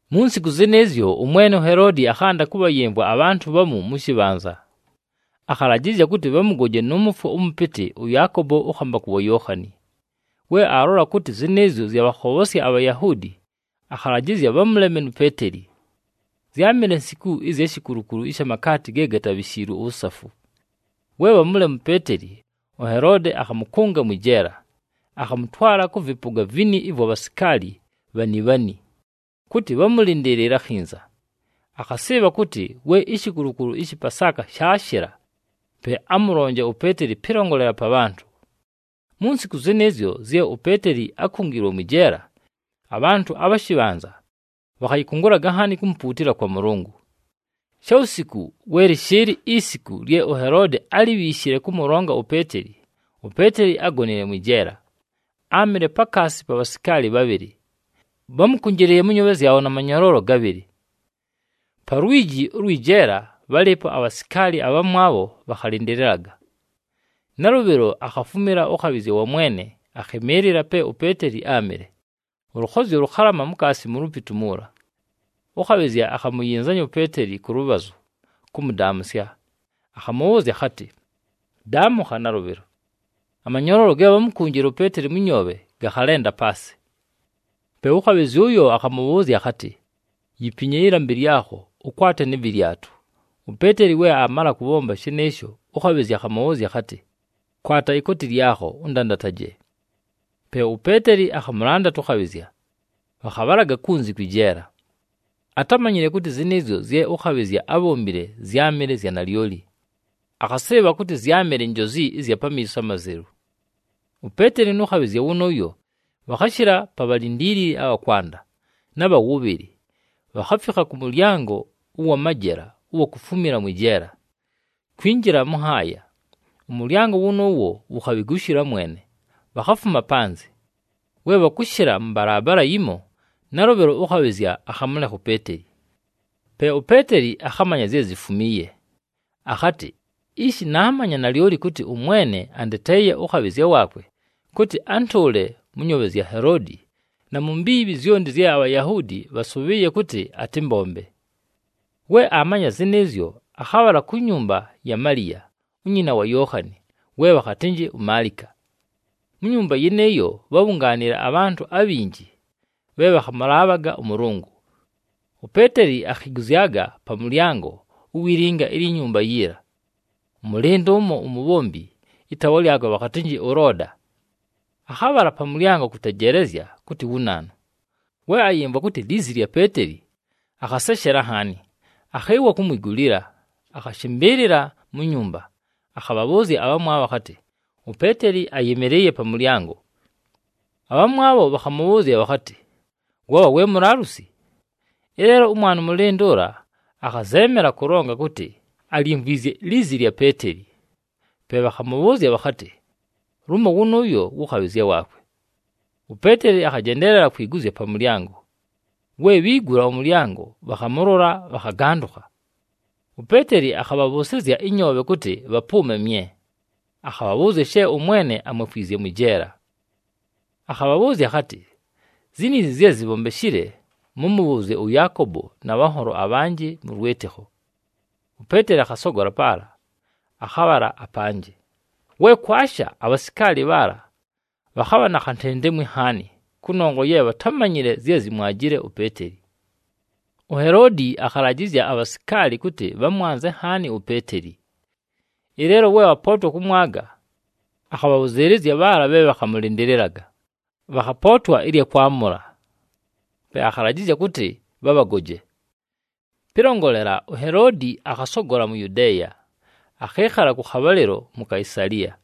Mu nsiku zɨnɨɨzyo, ʉmwene uHeloodi akhanda kʉbhayɨmvwa abhantʉ bhamu mʉ shɨbhanza. Akhalajɨzya kʉtɨ bhamʉgoje nʉ mʉfwo ʉmʉpɨtɨ ʉYaakobo ʉkhambakʉ wa Yookhani. We aalola kʉtɨ zɨnɨɨzyo zyabhakhobhosya aBhayahuudi, akhalajɨzya bhamʉleme nu Peeteli. Zyámɨle nsiku ɨzya shikulukulu ɨsha makaati ge gatabhishiilwe uwusafu. We bhamʉlema uPeeteli, uHeloodi akhamʉkʉnga mwɨ jeela. Akhamʉtwala kʉ vɨpʉga vini ɨvwa bhasikaali bhani bhani, kʉtɨ bhamʉlɨndɨɨlɨle akhinza. Akhasɨɨbha kʉtɨ we ishikulukulu ɨshɨ Pasaaka shaashɨla pe amʉlonje uPeeteli pɨlongolela pa bhantʉ. Mu nsiku zɨnɨɨzyo zye uPeeteli ákungiilwe mwɨ jeela, abhantʉ abha shɨbhanza bhakhayɨkʉngʉlaga nhaani kumupuutila kwa Mʉlʉngʉ. Shawusiku, we lɨshɨɨlɨ isiku lye uHeloodi álibhiishile kʉmʉlonga uPeeteli, uPeeteli ágonile mwɨ jeela. Áamɨle pakaasi pa bhasikaali bhabhɨlɨ, bhámʉkʉnjɨlɨɨye mʉ nyoobhe zyabho na manyoloolo gabhɨlɨ. Pa lwiji ʉlwɨ jeela bhálɨɨpo abhasikaali abhamwabho bhakhalɨndɨlɨlaga. Nalʉbhɨlo akhafumila ʉkhabhɨzya wa Mwene akhɨmɨɨlɨla pe uPeeteli áamɨle, ʉlʉkhozyo lʉkhalama mukaasi mu lupitu muula. Ʉkhabhɨzya akhamuyinzanya uPeeteli kʉ lʉbhazʉ kʉmʉdaamʉsya, akhamʉbhʉʉzya akhatɨ, “Daamʉkha nalʉbhɨlo!” Amanyoloolo ge bhámukunjile uPeeteli mʉ nyoobhe gakhalenda paasɨ! Pe ʉkhabhɨzya ʉyo akhamʉbhʉʉzya akhatɨ, “Yipinye ɨlambɨ lyakho, ʉkwate nɨ vɨlyatʉ.” UPeeteli we aamala kʉbhomba shɨnɨɨsho, ʉkhabhɨzya akhamʉbhʉʉzya akhatɨ, “Kwata ikooti lyakho, ʉndandataje!” Pe uPeeteli akhamʉlandata ʉkhabhɨzya, bhakhabhalaga kunzi kwɨ jeela. Atámanyile kʉtɨ zɨnɨɨzyo zye ʉkhabhɨzya ábhombile zyámɨle zya nalyoli, akhasɨɨbha kʉtɨ zyámɨle njozi ɨzya pamiiso amazelu. UPeeteli nʉ khabhɨzya wʉnʉʉyo bhakhashɨla pa bhalindiilili abha kwanda, na bha wʉbhɨlɨ, bhakhafikha kʉ mʉlyango ʉwa majela ʉwa kufumila mwɨ jeela, kwinjila mʉ nhaaya. Ʉmʉlyango wʉnʉʉwo wukhabhigushila mwene, bhakhafuma panzɨ. We bhakʉshɨla mʉ mbalaabala yimo, nalʉbhɨlo ʉkhabhɨzya akhamʉlekha uPeeteli. Pe uPeeteli akhamanya zye zifumiiye, akhatɨ, “Ishi naamanya nalyoli kʉtɨ ʉMwene andeteeye ʉkhabhɨzya waakwe, kʉtɨ antʉʉle mʉ nyoobhe zya Heloodi na mu mbiibhi zyonti zye aBhayahuudi bhasʉbhɨɨye kʉtɨ atɨmbombe.” We aamanya zɨnɨɨzyo, akhabhala ku nyumba ya Maliya, unyina wa Yookhani we bhakhatɨnjɨ uMaalika. Mu nyumba yɨnɨɨyo bhábhungaanile abhantʉ abhinji bhe bhakhamʉlaabhaga ʉMʉlʉngʉ. UPeeteli akhiguzyaga pa mʉlyango uwi linga ilyi nyumba yiila. Ʉmʉlɨndʉ ʉmo umubhombi, ɨtaawa lyakwe bhakhatɨnjɨ ʉLooda, akhabhala pa mʉlyango kʉtejeelezya kʉtɨ wu naanu. We ayɨmvwa kʉtɨ lizi lya Peeteli, akhaseshela nhaani, akhɨɨwa kumwigulila, akhashɨmbɨɨlɨla mu nyumba. Akhabhabhʉʉzya abhamwabho akhatɨ, “UPeeteli ayɨmɨlɨɨye pa mʉlyango!” Abhamwabho bhakhamʉbhʉʉzya bhakhatɨ, “Wabha we mulaalusi!” Ɨleelo ʉmwana ʉmʉlɨndʉ ʉla akhazeemela kʉlonga kʉtɨ alyimvwizye lizi lya Peeteli, pe bhakhamʉbhʉʉzya bhakhatɨ, “Lumo wʉnʉʉyo wʉ khabhɨzya waakwe.” UPeeteli akhajendeelela kwiguzya pa mʉlyango. We bhiigula ʉmʉlyango, bhakhamʉlola, bhakhagandʉkha. UPeeteli akhabhabhʉʉsɨzya ɨnyoobhe kʉtɨ bhapʉʉme mye, akhabhabhʉʉzya she ʉMwene amwefwizye mwɨ jeela. Akhabhabhʉʉzya akhatɨ, “Ziniizi zye zibhombeshile, mʉmʉbhʉʉzye ʉYaakobo na bhanholo abhanjɨ mʉ lwɨtɨkho.” UPeeteli akhasogola paala, akhabhala apanjɨ. We kwasha, abhasikaali bhaala bhakhabha na khantentemwi nhaani kʉnongwa ye bhatámanyile zye zyámwajile uPeeteli. UHeloodi akhalajɨzya abhasikaali kʉtɨ bhamwanze nhaani uPeeteli. Ɨleelo we bhapootwa kʉmwaga, akhabhabhʉzɨɨlɨzya bhaala bhe bhakhamʉlɨndɨlɨlaga, bhakhapootwa ɨlya kwamʉla, pe akhalajɨzya kʉtɨ bhabhagoje. Pɨlongolela, uHeloodi akhasogola mu Yudeeya, akhɨɨkhala kʉ khabhalɨlo mu Kaisaliya.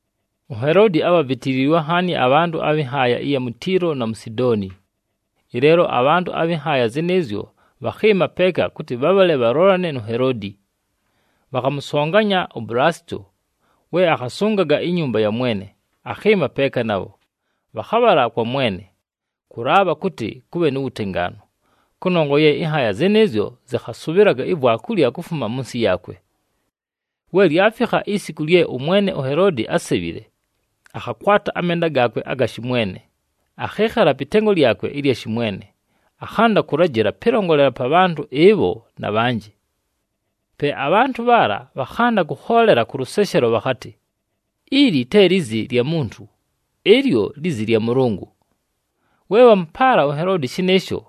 UHeloodi ábhavitiliilwe nhaani abhantʉ abhɨ nhaaya ɨya mu Tiilo, na mu Sidooni. Ɨleelo abhantʉ abhɨ nhaaya zɨnɨɨzyo bhakhɨɨma peeka kʉtɨ bhabhale bhalolane nu Heloodi. Bhakhamʉsonganya uBulasito, we akhasʉngaga inyumba ya mwene, akhɨɨma peeka nabho. Bhakhabhala kwa mwene, kʉlaabha kʉtɨ kʉbhe nu wutengaanu, kʉnongwa ye ɨnhaaya zɨnɨɨzyo zɨkhasʉbhɨlaga ivwakulya kufuma mʉ nsɨ yaakwe. We lyafikha isiku lye ʉmwene uHeloodi ásebhile, akhakwata amenda gaakwe aga shɨmwene, akhɨɨkhala pɨ tengo lyakwe ɨlya shɨmwene, akhanda kʉlajɨla pɨlongolela pa bhantʉ ɨbho na bhanjɨ. Pe abhantʉ bhaala bhakhanda kʉkhoolela kʉ lʉseshelo bhakhatɨ, “Ili te lizi lya muntu! Ɨlyo lizi lya mʉlʉngʉ!” We bhamʉpaala uHeloodi shɨnɨɨsho,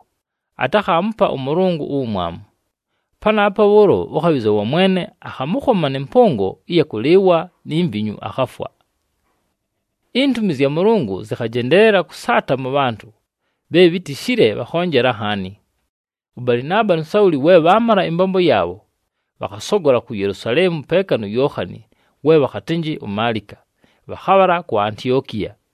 atakhaamupa ʉMʉlʉngʉ uwumwamu. Panaapo bhʉʉlo, ʉkhabhɨzya wa Mwene akhamʉkhoma nɨ mpʉngo ɨya kʉlɨɨwa ni mivinyu, akhafwa. Intumi zya Mʉlʉngʉ zɨkhajendeelela kʉsaata mʉ bhantʉ, bhe bhitishile bhakhonjela nhaani. ɄBalɨnaaba nu Sauli we bhaamala ɨmbombo yaabho, bhakhasogola ku Yelusaleemu peeka nu Yookhani we bhakhatɨnjɨ uMaalika, bhakhabhala ku Antiokiya.